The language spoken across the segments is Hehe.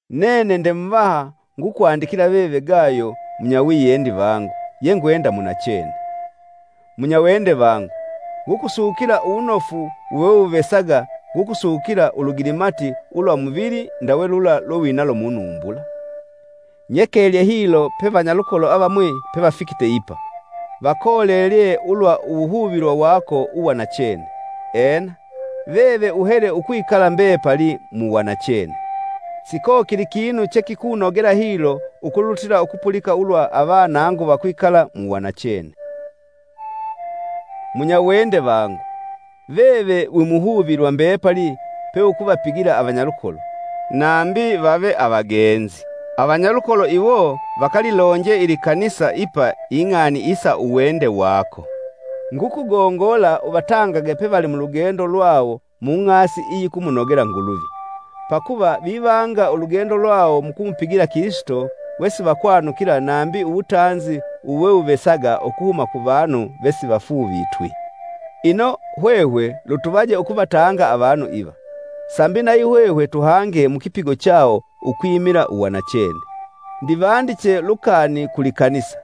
Nene nde muvaha, ngukwandikila veve Gayo, munyawiyendi vangu, yengwenda munachene. Munyawende vangu, ngukusukila uwunofu wewewuvesaga, ngukusukila ulugilimati ulwa muvili ndawe lula lwewinalo munumbula. Nyekelye hilo pe vanyalukolo avamwi pevafikite ipa, vakolelye ulwa uwuhuvilwa wako ulwa nachene; ena, veve uhele ukwikala mbepali mu wanachene. Sikokili kinu chekikunogela hilo ukulutila ukupulika ulwa avanangu vakwikala mu wanachene. Munyawende vangu, veve wimuhuvilwa mbepali peukuvapigila avanyalukolo, nambi vave avagenzi! Avanyalukolo iwo vakalilonje ilikanisa ipa ing'ani isa uwende wako. Ngukugongola uvatangage pevali mulugendo lwawo mung'asi iyikumunogela Nguluvi. Pakuva vivanga ulugendo lwawo mukumupigila Kilisito wesivakwanukila nambi uwutanzi uwewuvesaga ukuhuma kuvanu vesivafuuvitwi. Ino, hwehwe lutuvaje ukuvatanga avanu iva, sambi nayihwehwe tuhange mukipigo chawo ukwimila uwanachene. Ndivandiche lukani ku likanisa;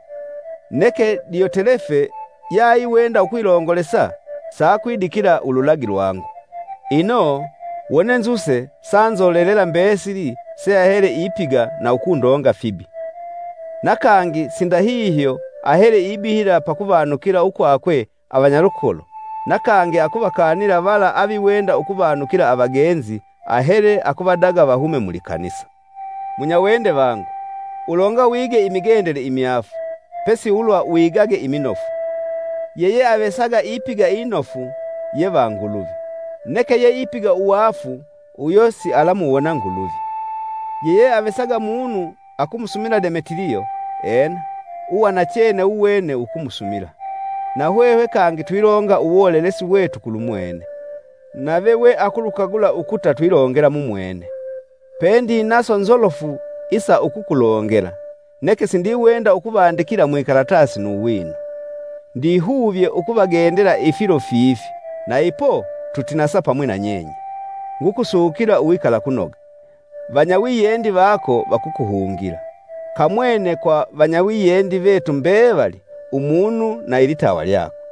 neke Diyotelefe, yeaiwenda ukwilongolesa, sakwidikila ululagi lwangu. Ino, wone nzuse sa nzolelela mbesili seahele ipiga na ukundonga fibi. Na kangi sindahihyo ahele ibihila pakuvanukila ukwakwe avanyalukolo na kangi akuvakanila vala aviwenda ukuvanukila avagenzi ahele akuvadaga vahume mulikanisa. Munyawende vangu, ulonga wige imigendele imyaafu, pesi ulwa wigage iminofu. Yeyeavesaga ipiga inofu ye va Nguluvi, neke yeipiga uwaafu uyo sialamuwona Nguluvi. Yeyeavesaga munu akumusumila Demetiliyo; ena, uwanachene wuwene wukumusumila. Nahwehwe kangi twilonga uwolelesi wetu kulumwene, nave we ukulukagula ukuta twilongela mumwene. Pendinaso nzolofu isa ukukulongela, neke sindiwenda ukuvandikila mwikalatasi nu wino. Ndihuvye ukuvagendela ifilo fifi na ipo tutinasa pamwi na nyenye. Ngukusukila uwikalakunoga. Vanyawiyendi vako vakukuhungila. Kamwene kwa vanyawiyendi vetu mbevali umunu na ilitawa lyakwe.